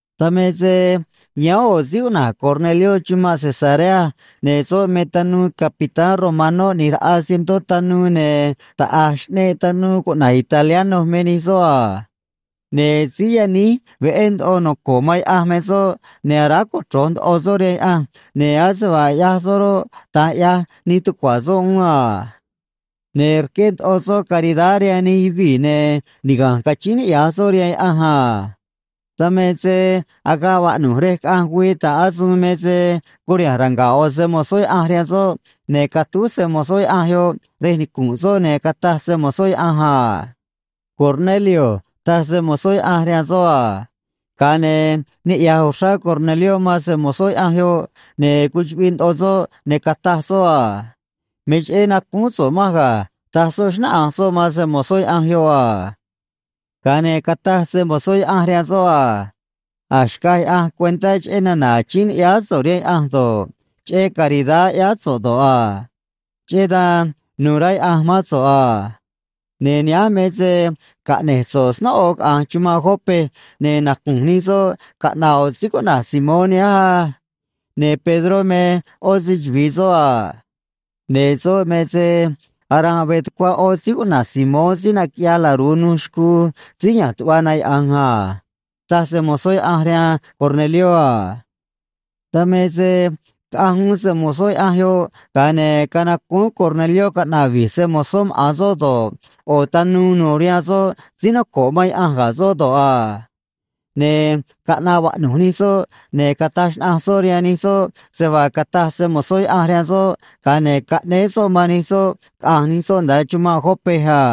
Dan me se yáán ꞌo̱ síí cuꞌna̱j Cornelió chumanꞌ Cesarea, ne̱ soꞌ me tanuu capitán romanó ꞌni̱j raꞌa cientó tanuu, ne̱ taꞌa̱j xꞌneꞌ tanuu cuꞌna̱j Italiano me nij soꞌ a. Ne̱ si̱j yaníj veꞌé ndoꞌo noco̱ꞌ man Yaꞌanj me soꞌ, ne̱ aráj cochro̱j ndoꞌo soꞌ rihaan Yaꞌanj, ne̱ ase vaa ꞌyaj soꞌ roꞌ, da̱nj ꞌyaj nij tucua̱ soꞌ uún a. Ne̱ rqué ndoꞌo soꞌ caridad rihaan nij yuvii̱, ne̱ niga̱nj cachíín niꞌya̱j soꞌ rihaan Yaꞌanj a. Dan me se agaꞌ vaꞌnu̱j rej caꞌanj güii ta̱ꞌ asuun me se curiha̱nj ranga̱ꞌ ꞌo̱ se‑mo̱zó Yaꞌanj rihaan soꞌ, ne̱ catúj se‑mo̱zó Yaꞌanj yoꞌ rej nicu̱nꞌ soꞌ, ne̱ cataj se‑mo̱zó Yaꞌanj a: ―Cornelio ―taj se‑mo̱zó Yaꞌanj rihaan soꞌ a. Ga̱a ne̱ niꞌya̱j uxrá Cornelió man se‑mo̱zó Yaꞌanj yoꞌ, ne̱ cuchuꞌviꞌ ndoꞌo soꞌ, ne̱ cataj soꞌ a: ―Me cheꞌé nacúún so̱ꞌ manj ga̱ ―taj soꞌ, xnáꞌanj soꞌ man se‑mo̱zó Yaꞌanj yoꞌ a. Ga̱a ne̱ cataj se‑mo̱zó Yaꞌanj rihaan soꞌ a: ―A̱j xcaj Yaꞌanj cuentá cheꞌé nana̱ achíín ni̱ꞌyáá so̱ꞌ rihaan Yaꞌanj do̱ꞌ, cheꞌé caridad ꞌyáá so̱ꞌ do̱ꞌ a. Cheꞌé dan nu̱u̱ rá Yaꞌanj mán so̱ꞌ a. Ne̱ nihánj me se caꞌne̱j so̱ꞌ snóꞌo caꞌa̱nj chumanꞌ Jope, ne̱ nacu̱nj nij soꞌ caꞌna̱ꞌ ꞌo̱ síí cuꞌna̱j Simón nihánj á. Ne̱ Pedró me ꞌó se‑chuvi̱i soꞌ a. Ne̱ soꞌ me se aranꞌ veꞌ tucuá ꞌó síí cuꞌna̱j Simón síí naquiꞌyaj laru̱u nuj xcuu síí ya̱nj tuꞌva na yaꞌa̱nj a ―taj se‑mo̱zó Yaꞌanj rihaan Cornelió a. Dan me se caꞌanj uún se‑mo̱zó Yaꞌanj yoꞌ, ga̱a ne̱ canacúún Cornelió caꞌna̱ꞌ vi̱j se‑mo̱zó maꞌa̱n soꞌ do̱ꞌ, ꞌo̱ tanuu nu̱u̱ rihaan soꞌ, síí noco̱ꞌ man Yaꞌanj ga̱ soꞌ do̱ꞌ a. Ne̱ caꞌnaꞌ vaꞌnu̱j nij soꞌ, ne̱ cataj xnaꞌanj soꞌ rihaan nij soꞌ se vaa cataj se‑mo̱zó Yaꞌanj rihaan soꞌ, ga̱a ne̱ caꞌnéé soꞌ man nij soꞌ caꞌa̱nj nij soꞌ nda̱a chumanꞌ Jope a.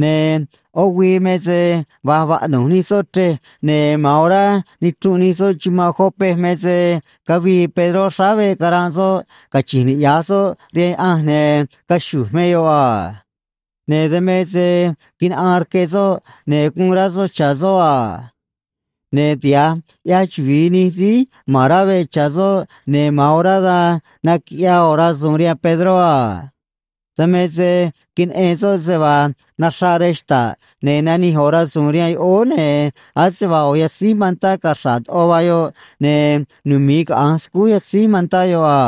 Ne̱ ꞌó güii me se va̱j vaꞌnu̱j nij soꞌ chrej, ne̱ ma̱an orá nichrunꞌ nij soꞌ chumanꞌ Jope me se cavii Pedró xráá veꞌ caranꞌ soꞌ, cachi̱nj niꞌya̱j soꞌ rihaan Yaꞌanj, ne̱ caxu̱j me yoꞌ a. Ne̱ dan me se quinaꞌaan rque soꞌ, ne̱ guun rá soꞌ cha̱ soꞌ a. Ne̱ tiha̱j ꞌyaj chuvi̱i nij síí ma̱n rá veꞌ cha̱ soꞌ, ne̱ ma̱an orá dan naquiꞌyaa ꞌo̱ rasu̱u̱n rihaan Pedró a. Dan me se queneꞌen soꞌ se vaa naxraꞌ rej xta̱ꞌ, ne̱ nanij ꞌo̱ rasu̱u̱n rihaan yoꞌóó, ne̱ ase vaa ꞌo̱ yatzíj mantá caxra̱ꞌ ndoꞌo vaa yoꞌ, ne̱ numi̱i caꞌa̱nj scúj yatzíj mantá yoꞌ a.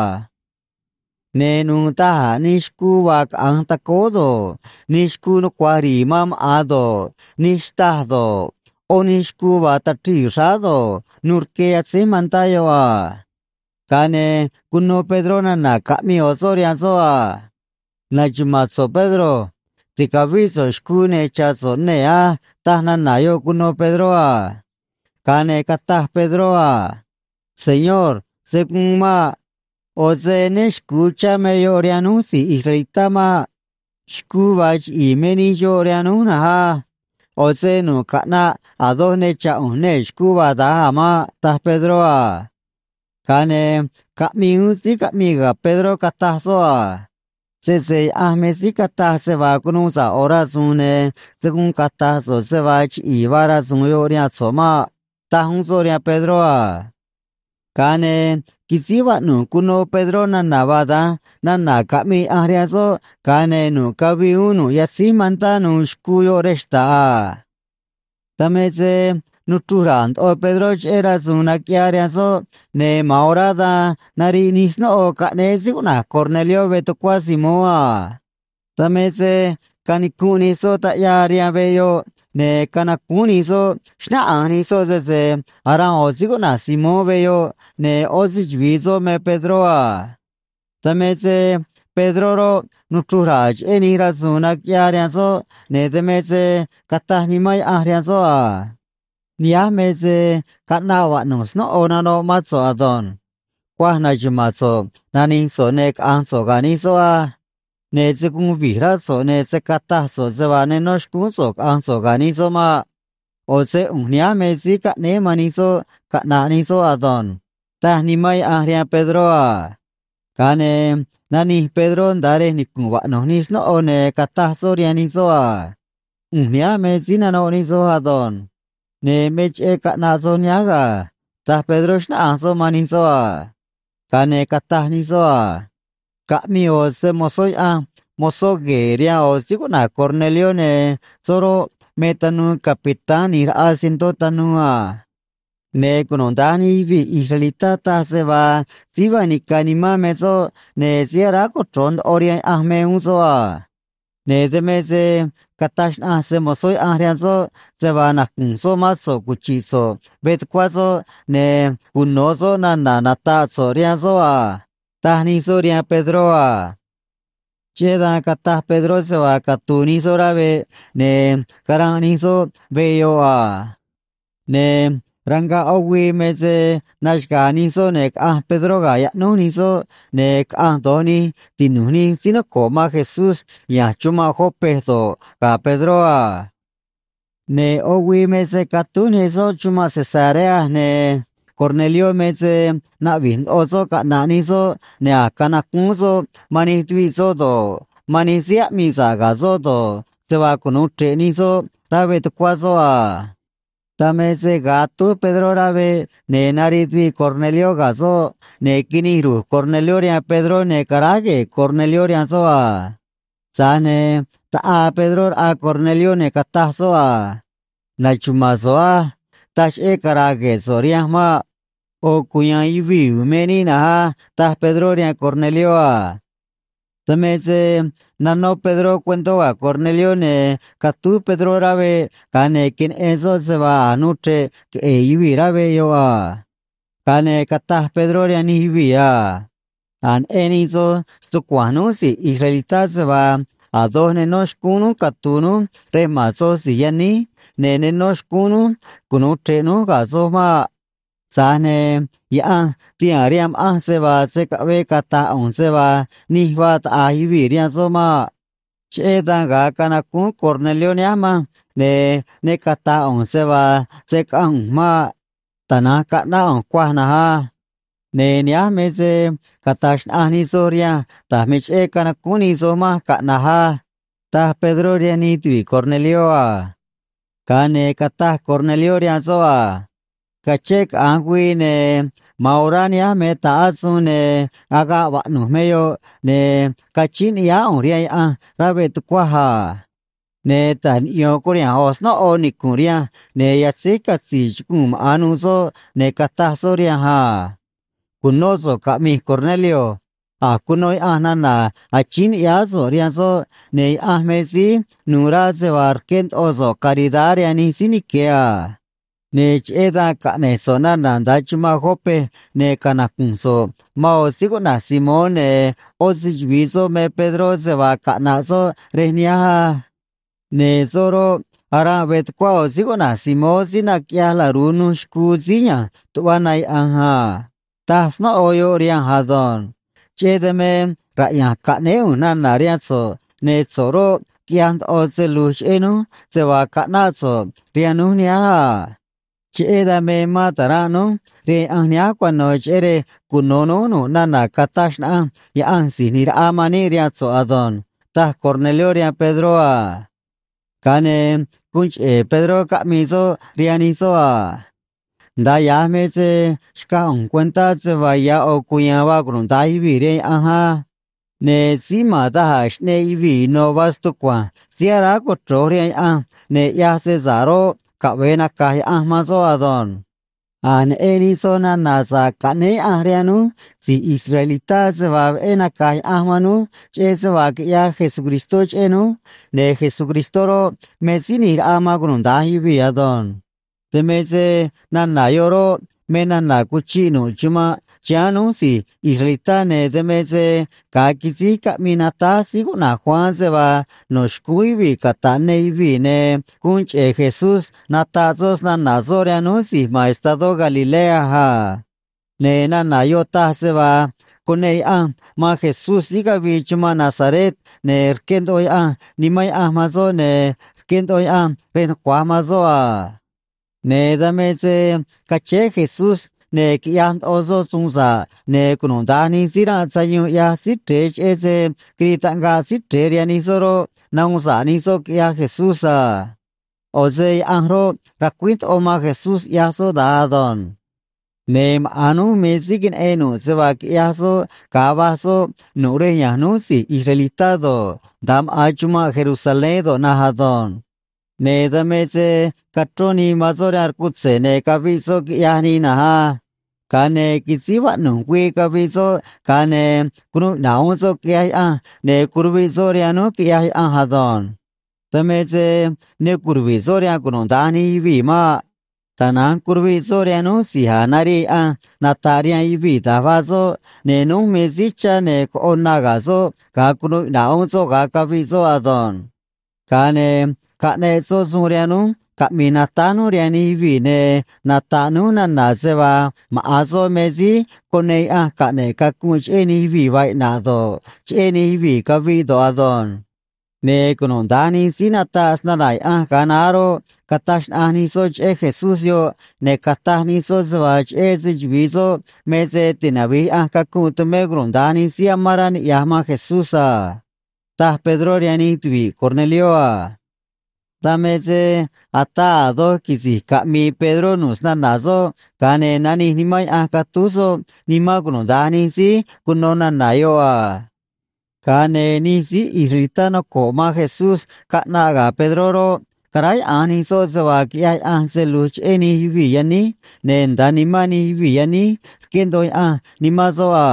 Ne̱ nu̱u̱ da̱j a̱ nij xcuu vaa caꞌa̱nj tacóó do̱ꞌ, nij xcuu nucua̱j ri̱i̱ man maꞌa̱n do̱ꞌ, nij xtâj do̱ꞌ, ꞌó nij xcuu vaa tachrii̱ xráá do̱ꞌ, nu̱u̱ rque yatzéj mantá yoꞌ a. Ga̱a ne̱ cuno Pedró nana̱ caꞌmii ꞌo̱ soꞌ rihaan soꞌ a: ―Na̱xuma̱a̱n so̱ꞌ, Pedro. Ti̱cavíꞌ so̱ꞌ xcuu, ne̱ cha̱ so̱ꞌ nee̱ á ―taj nana̱ yoꞌ cuno Pedró a. Ga̱a ne̱ cataj Pedró a: ―Señor, se̱ guun maꞌ. ꞌO̱ se né xcu̱u chá me yoꞌ rihaan núj si̱j israelitá maꞌ. Xcuu vaa chiꞌi̱i̱ me nij xoꞌ rihaan núj na̱nj á. ꞌO̱ se nu̱ꞌ caꞌnaꞌ a̱ doj ne cha̱ ꞌu̱nj nee̱ xcuu vaa da̱nj a̱ maꞌ ―taj Pedró a. Ga̱a ne̱ caꞌmii uún síí caꞌmii ga̱ Pedró, cataj soꞌ a: ―Sese Yaꞌanj me síí cataj se vaa cunuu sa̱ꞌ ꞌo̱ rasu̱u̱n, ne̱ se̱ guun cata̱j so̱ꞌ se vaa chiꞌi̱i̱ vaa rasu̱u̱n yoꞌ rihaan so̱ꞌ maꞌ ―taj uún soꞌ rihaan Pedró a. Ga̱a ne̱ quisíj vaꞌnu̱j cuno Pedró nana̱ vaa da̱nj nana̱ caꞌmii Yaꞌanj rihaan soꞌ, ga̱a ne̱ nu̱ꞌ cavii uún nu̱ꞌ yatzíj mantá nu̱u̱ xcuu yoꞌ rej xta̱ꞌ a. Dan me se nuchruj ra̱a̱ ndoꞌo Pedró cheꞌé rasu̱u̱n naquiꞌyaa rihaan soꞌ, ne̱ ma̱an orá dan nariꞌ nij snóꞌo caꞌnéé síí cuꞌna̱j Cornelió veꞌ tucuá Simón a. Dan me se canicunꞌ nij soꞌ taꞌyaa rihaan veꞌ yoꞌ, ne̱ canacúún nij soꞌ, xnáꞌanj nij soꞌ sese aranꞌ ꞌo̱ síí cuꞌna̱j Simón veꞌ yoꞌ ne̱ ꞌó se‑chuvi̱i soꞌ me Pedró a. Dan me se Pedró roꞌ, nuchruj ra̱a̱ cheꞌé nij rasu̱u̱n naquiꞌyaa rihaan soꞌ, ne̱ dan me se cataj Nimán Yaꞌanj rihaan soꞌ a: ―Nihánj me se caꞌnaꞌ vaꞌnu̱j snóꞌo nanoꞌ mán so̱ꞌ ado̱nj. Cuaj na̱xuma̱a̱n so̱ꞌ, nani̱j so̱ꞌ, ne̱ caꞌa̱nj so̱ꞌ ga̱ nij soꞌ á. Ne̱ se̱ guun vi̱j rá so̱ꞌ, ne̱ se̱ cataj so̱ꞌ se vaa ne nó xcúún so̱ꞌ caꞌa̱nj so̱ꞌ ga̱ nij soꞌ maꞌ. ꞌO̱ se ꞌu̱nj nihánj me síí caꞌnéé man nij soꞌ caꞌna̱ꞌ nij soꞌ ado̱nj ―taj Nimán Yaꞌanj rihaan Pedró a. Ga̱a ne̱ nanij Pedró nda̱a rej nicu̱nꞌ vaꞌnu̱j nij snóꞌo, ne̱ cataj soꞌ rihaan nij soꞌ a: ―ꞌU̱nj nihánj me síí nanoꞌ nij soj ado̱nj. Ne̱ me cheꞌé caꞌnaꞌ soj nihánj ga̱ ―taj Pedró, xnáꞌanj soꞌ man nij soꞌ a. Ga̱a ne̱ cataj nij soꞌ a: ―Caꞌmii ꞌo̱ se‑mo̱zó Yaꞌanj mozó gue̱e̱ rihaan ꞌo̱ síí cuꞌna̱j Cornelió, ne̱ soꞌ roꞌ, me tanuu capitán ꞌni̱j raꞌa cientó tanuu a. Ne̱ cunuda̱nj nij yuvii̱ israelitá taj se vaa síí vaa nica̱ nimán me soꞌ ne̱ síí aráj cochro̱j ndoꞌo rihaan Yaꞌanj me uún soꞌ a. Ne̱ dan me se cataj xnaꞌanj se‑mo̱zó Yaꞌanj rihaan soꞌ se vaa nacu̱nj soꞌ mán so̱ꞌ cuchi̱ꞌ so̱ꞌ veꞌ tucuá soꞌ ne̱ cuno̱ soꞌ nana̱ nata̱ꞌ so̱ꞌ rihaan soꞌ a ―taj nij soꞌ rihaan Pedró a. Cheꞌé dan cataj Pedró se vaa catu̱u̱ nij soꞌ rá veꞌ, ne̱ caranꞌ nij soꞌ veꞌ yoꞌ a. Ne̱ ranga̱ꞌ ꞌó güii me se naxaga̱a̱ nij soꞌ, ne̱ caꞌanj Pedró ga̱ yaꞌnúj nij soꞌ, ne̱ caꞌanj do̱j nij tinu̱j nij síí noco̱ꞌ man Jesús ya̱nj chumanꞌ Jope do̱ꞌ, ga̱ Pedró a. Ne̱ ꞌó güii me se catúj nij soꞌ chumanꞌ Cesarea, ne̱ Cornelió me se naꞌvi̱j ndoꞌo soꞌ caꞌna̱ꞌ nij soꞌ, ne̱ a̱j canacúún soꞌ man nij tuviꞌ soꞌ do̱ꞌ, man nij síí aꞌmii sa̱ꞌ ga̱ soꞌ do̱ꞌ, se vaa cunu̱u chre̱ꞌ nij soꞌ rá veꞌ tucuá soꞌ a. Dan me se ga̱a atúj Pedró rá veꞌ, ne̱ nariꞌ tuviꞌ Cornelió ga̱ soꞌ, ne̱ quinij ru̱j Cornelió rihaan Pedró, ne̱ caráj gue̱e̱ Cornelió rihaan soꞌ a. Tza̱j ne̱ taꞌaa Pedró raꞌa Cornelió, ne̱ cataj soꞌ a: ―Na̱xuma̱a̱n so̱ꞌ á. Taj cheꞌé cara̱a̱ gue̱e̱ so̱ꞌ rihanj maꞌ. ꞌO̱ cuya̱a̱n yuvii̱ u̱u̱n me níꞌ na̱nj á ―taj Pedró rihaan Cornelió a. Dan me se nanó Pedró cuentó ga̱ Cornelió, ne̱ catúj Pedró rá veꞌ, ga̱a ne̱ queneꞌen soꞌ se vaa a̱j nuu chre̱ꞌ queꞌe̱e̱ yuvii̱ rá veꞌ yoꞌ a. Ga̱a ne̱ cataj Pedró rihaan nij yuvii̱ a: ―A̱j neꞌen nij soj stucua̱nj núj si̱j israelitá se vaa a̱ doj ne nó xcúún núj catu̱u̱ núj rej ma̱n soj si̱j yaníj, ne̱ ne nó xcúún núj cunu̱u chre̱ꞌ núj ga̱ soj maꞌ. Tza̱j ne̱ Yaꞌanj tihaa̱n rihaan ma̱ꞌanj se vaa se̱ caꞌvee cata̱j ꞌu̱nj se vaa nij vaa taꞌa̱j yuvii̱ rihaan soꞌ maꞌ. Cheꞌé dan ga̱a canacúún Cornelió nihánj manj, ne̱ ne cata̱j ꞌu̱nj se vaa se̱ caꞌanj ꞌu̱nj maꞌ. Tana̱nj caꞌnáꞌ ꞌu̱nj cuaj na̱nj á. Ne̱ nihánj me se cata̱j xnaꞌanj nij soj rihanj da̱j me cheꞌé canacúún nij soj manj caꞌna̱j á ―taj Pedró rihaan nij tuvi̱ꞌ Cornelió a. Ga̱a ne̱ cataj Cornelió rihaan soꞌ a: ―Cachén caꞌa̱nj güii ne̱ ma̱an orá nihánj me ta̱ꞌ asuun, ne̱ agaꞌ vaꞌnu̱j me yoꞌ, ne̱ cachíín ni̱ꞌyáá ꞌu̱nj rihaan Yaꞌanj rá veꞌ tucuaj a. Ne̱ ta̱j niꞌyo̱n curiha̱nj ꞌo̱ snóꞌo nicu̱nꞌ rihanj, ne̱ yatzéj catzi̱i̱ chuguu̱n maꞌa̱n nuû soꞌ, ne̱ cataj soꞌ rihanj a: “Cu̱nó so̱ꞌ caꞌmi̱j, Cornelio. A̱j cuno Yaꞌanj nana̱ achíín ni̱ꞌyáá so̱ꞌ rihaan soꞌ, ne̱ Yaꞌanj me síí nu̱u̱ rá se vaa rqué ndoꞌo so̱ꞌ caridad rihaan nij síí nique̱ a. Ne̱ cheꞌé dan caꞌne̱j so̱ꞌ nana̱ nda̱a chumanꞌ Jope, ne̱ canacu̱nj so̱ꞌ man ꞌo̱ síí cuꞌna̱j Simón ne̱ ꞌó se‑chuvi̱i soꞌ me Pedró se vaa caꞌna̱ꞌ soꞌ rej nihánj á. Ne̱ soꞌ roꞌ, aranꞌ veꞌ tucuá ꞌo̱ síí cuꞌna̱j Simón síí naquiꞌyaj laru̱u nuj xcuu síí ya̱nj tuꞌva na yaꞌa̱nj a”, taj snóꞌo yoꞌ rihanj ado̱nj. Cheꞌé dan me raꞌya̱nj caꞌnéé ꞌu̱nj nana̱ rihaan so̱ꞌ, ne̱ so̱ꞌ roꞌ, quiꞌyaj ndoꞌo se lu̱j cheꞌé núj se vaa caꞌnáꞌ so̱ꞌ rihaan núj nihánj a. Cheꞌé dan me mán ta̱ranꞌ núj rihaan Yaꞌanj nihánj cuano̱, cheꞌé rej cuno̱ núj nu̱ꞌ nana̱ cataj xnaꞌanj Yaꞌanj Si̱j ꞌNi̱j Raꞌa man níꞌ rihaan so̱ꞌ ado̱nj ―taj Cornelió rihaan Pedró a. Ga̱a ne̱ guun cheꞌe̱ Pedró caꞌmii soꞌ rihaan nij soꞌ a: ―Nda̱a ya̱j me se xcaj ꞌu̱nj cuentá se vaa ya̱ ꞌo̱ cuya̱a̱n vaa cunuda̱nj yuvii̱ rihaan Yaꞌanj á. Ne̱ síí ma̱n da̱j a̱ xꞌneꞌ yuvii̱ ino̱ vaa stucua̱nj síí aráj cochro̱j rihaan Yaꞌanj ne̱ ꞌyaj se sa̱ꞌ roꞌ, caꞌve̱e naca̱j Yaꞌanj man soꞌ ado̱nj. A̱j neꞌen nij soj nana̱ sa̱ꞌ caꞌnéé Yaꞌanj rihaan núj si̱j israelitá se vaa veꞌé naca̱j Yaꞌanj man núj cheꞌé se vaa quiꞌyaj Jesucristó cheꞌé núj, ne̱ Jesucristó roꞌ, me Síí ꞌNi̱j Raꞌa man cunuda̱nj yuvii̱ ado̱nj. Dan me se nana̱ yoꞌ roꞌ, me nana̱ cuchiꞌ nu̱ꞌ chumanꞌ chiháán núj si̱j israelitá, ne̱ dan me se ga̱a quisíj caꞌmii natáj síí cuꞌna̱j Juan se vaa no̱ xcúún yuvii̱ cata̱ꞌ ne yuvii̱, ne̱ guun cheꞌe̱ Jesús nataꞌ soꞌ snana̱ soꞌ rihaan núj si̱j ma̱n estadó Galilea a. Ne̱ nana̱ yoꞌ taj se vaa cuneꞌ Yaꞌanj man Jesús síí cavii chumanꞌ Nazaret, ne̱ rqué ndoꞌo Yaꞌanj Nimán Yaꞌanj man soꞌ, ne̱ rqué ndoꞌo Yaꞌanj rej nucua̱j man soꞌ a. Ne̱ dan me se cachéé Jesús, ne̱ quiꞌyaj ndoꞌo soꞌ suun sa̱ꞌ, ne̱ cunuda̱nj nij síí ranꞌ sayuun ꞌyaj Síí Chre̱e cheꞌé se quirii taꞌngaꞌ Síí Chre̱e rihaan nij soꞌ roꞌ, nahuun sa̱ꞌ nij soꞌ, quiꞌyaj Jesús a. ꞌO̱ se Yaꞌanj roꞌ, racuíj ndoꞌo man Jesús ꞌyaj soꞌ da̱nj ado̱nj. ’Ne̱ maꞌa̱n núj me síí queneꞌen nu̱ꞌ se vaa quiꞌyaj soꞌ ga̱a va̱j soꞌ nu̱ꞌ rej ya̱nj núj si̱j israelitá do̱ꞌ, nda̱a maꞌa̱n chumanꞌ Jerusalén do̱ꞌ na̱nj ado̱nj. Ne̱ dan me se cachrón nii man soꞌ rihaan rcutze̱, ne̱ caviꞌ soꞌ, quiꞌyaj nii na̱nj á. Ga̱a ne̱ quisíj vaꞌnu̱j güii caviꞌ soꞌ, ga̱a ne̱ cunuu iꞌna̱ꞌ uún soꞌ, quiꞌyaj Yaꞌanj, ne̱ curuviꞌ soꞌ rihaan núj, quiꞌyaj Yaꞌanj ado̱nj. Dan me se ne curuvi̱ꞌ soꞌ rihaan cunuda̱nj nij yuvii̱ maꞌ. Tana̱nj curuviꞌ soꞌ rihaan núj si̱j a̱j narii Yaꞌanj nata̱ꞌ rihaan yuvii̱ da̱j vaa soꞌ, ne̱ núj me síí chá ne̱ coꞌo na ga̱ soꞌ ga̱a cunuu iꞌna̱ꞌ uún soꞌ ga̱a caviꞌ soꞌ ado̱nj. Ga̱a ne̱ caꞌneꞌ soꞌ suun rihaan núj caꞌmi̱i̱ natáj núj rihaan nij yuvii̱ ne̱ nata̱ꞌ núj nana̱ se vaa maꞌa̱n soꞌ me síí cuneꞌ Yaꞌanj caꞌne̱ꞌ cacunꞌ cheꞌé nij yuvii̱ vaa iꞌna̱ꞌ do̱ꞌ, cheꞌé nij yuvii̱ caviꞌ do̱ꞌ ado̱nj. Ne̱ cunuda̱nj nij síí nataꞌ snana̱ Yaꞌanj ga̱a naá roꞌ, cataj xnaꞌanj nij soꞌ cheꞌé Jesús yoꞌ, ne̱ cataj nij soꞌ se vaa cheꞌé se‑chuvi̱i soꞌ me se tinavi̱j Yaꞌanj cacunꞌ tumé cunuda̱nj nij síí amán rá niꞌya̱j man Jesús a ―taj Pedró rihaan nij tuvi̱ꞌ Cornelió a. Dan me se ataa a̱ doj quisi̱j caꞌmi̱i̱ Pedró nu̱ꞌ snana̱ soꞌ, ga̱a ne̱ nanij Nimán Yaꞌanj catúj soꞌ nimán cunuda̱nj nij síí cuno nana̱ yoꞌ a. Ga̱a ne̱ nij síí israelitá noco̱ꞌ man Jesús caꞌnaꞌ ga̱ Pedró roꞌ, caráyaꞌa̱nj nij soꞌ se vaa quiꞌyaj Yaꞌanj se lu̱j cheꞌé nij yuvii̱ yaníj ne̱ nda̱a nimán nij yuvii̱ yaníj rqué ndoꞌo Yaꞌanj Nimán soꞌ a.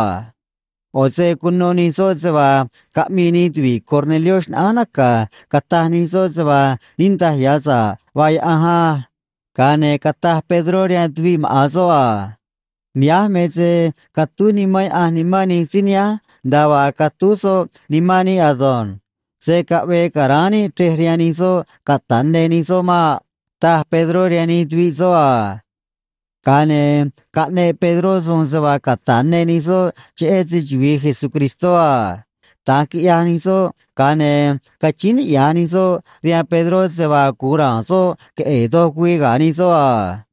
ꞌO̱ se cuno nij soꞌ se vaa caꞌmii nij tuvi̱ꞌ Cornelió xnaꞌánj naca̱, cataj nij soꞌ se vaa niꞌndaj ya̱ sa̱ꞌ vaa Yaꞌanj á. Ga̱a ne̱ cataj Pedró rihaan tuviꞌ maꞌa̱n soꞌ a: ―Nihánj me se catúj Nimán Yaꞌanj nimán nij síí nihánj nda̱a vaa catúj soꞌ nimán níꞌ ado̱nj. Se̱ caꞌvee ca̱ráán níꞌ chrej rihaan nij soꞌ cata̱ꞌ ne nij soꞌ maꞌ ―taj Pedró rihaan nij tuviꞌ soꞌ a. Ga̱a ne̱ caꞌneꞌ Pedró suun se vaa cata̱ꞌ ne nij soꞌ cheꞌé se‑chuvi̱i Jesucristó a. Da̱nj quiꞌyaj nij soꞌ, ga̱a ne̱ cachíín niꞌya̱j nij soꞌ rihaan Pedró se vaa gu̱un ra̱a̱n soꞌ queꞌe̱e̱ doj güii ga̱ nij soꞌ a.